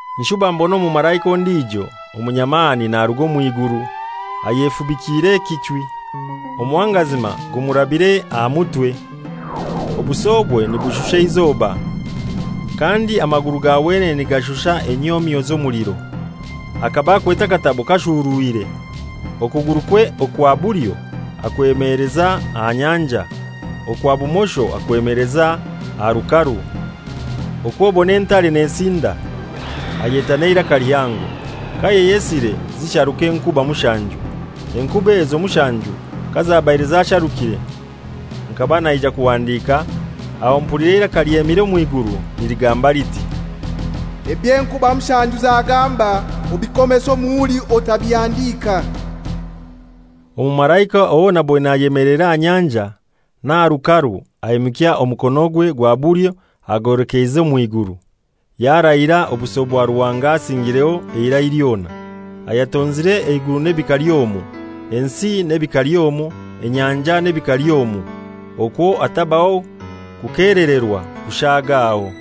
Nshuba mbona omumalaika ondijo omunyamani naruga omw'iguru, ayefubikire ekichwi, omuhangazima gumurabire aha mutwe, obusobwe nibushusha eizoba, kandi amaguru ga wenene nigashusha enyomyo z'omuliro. Akaba akwete akatabo kashurwire. Okugurukwe okwa bulyo akwemeleza aha nyanja, okwa bumosho akwemeleza aha rukaru. Okw'obon'entare nesinda, ayeta n'eiraka lihango. Kayayesire zisharuka enkuba mushanju. Enkuba ezo mushanju kazabaire zasharukire, nkaba naija kuhandika, aho mpulira eiraka lyemire omw'iguru niligamba liti, «Eby'enkuba mushanju zagamba obikomese omuhuri otabihandika.» Omumalaika owo naboine ayemeleire aha nyanja n'aha rukaru aimukya omukonogwe gwa bulyo agwolekeize omw'iguru, yarahira obuso bwa Ruhanga asingireho eirai lyona, ayatonzire eiguru n'ebikali omwo, ensi n'ebikali omwo, enyanja n'ebikali omwo, okwo hatabaho kukelererwa kushaagaho.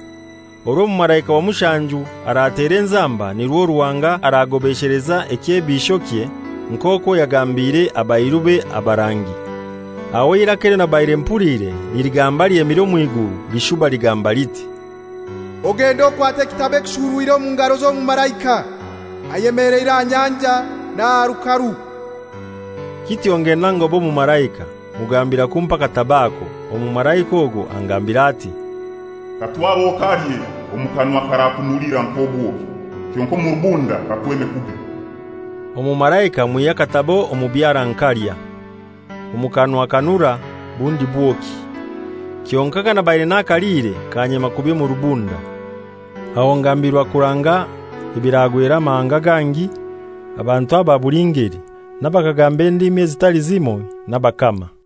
Orwo omumalaika wa mushanju aratera enzamba, nirwo Ruhanga aragobesheleza ekyebishokye, nk'okwo yagambiire abairube abarangi. Aho eiraka elyo nabaire mpuliire niligamba lyemire omw'iguru lishuba lingambira liti, «Ogende okwate ekitabo ekishurwire omu ngaro z'omumalaika ayemeleire aha nyanja n'aha rukaru.» Kityo ngenda ngoba omumalaika, mugambira kumpa akatabo ako. Omumalaika ogwo angambira ati, «Katware okalye, omu kanwa karakunulira nk'obwoki, kyonkai omu rubunda kakweme kubi.» Omumalaika mwihya akatabo omu byara nkalya. Omu kanwa kanura bundi bwoki, kyonkai kanabaire nakaliire kanyema kubi omu rubunda. Aho ngambirwa kuranga ebiragwera amahanga gangi, abantu aba buli ngeli, n'abakagamba endimi ezitali zimoi n'abakama.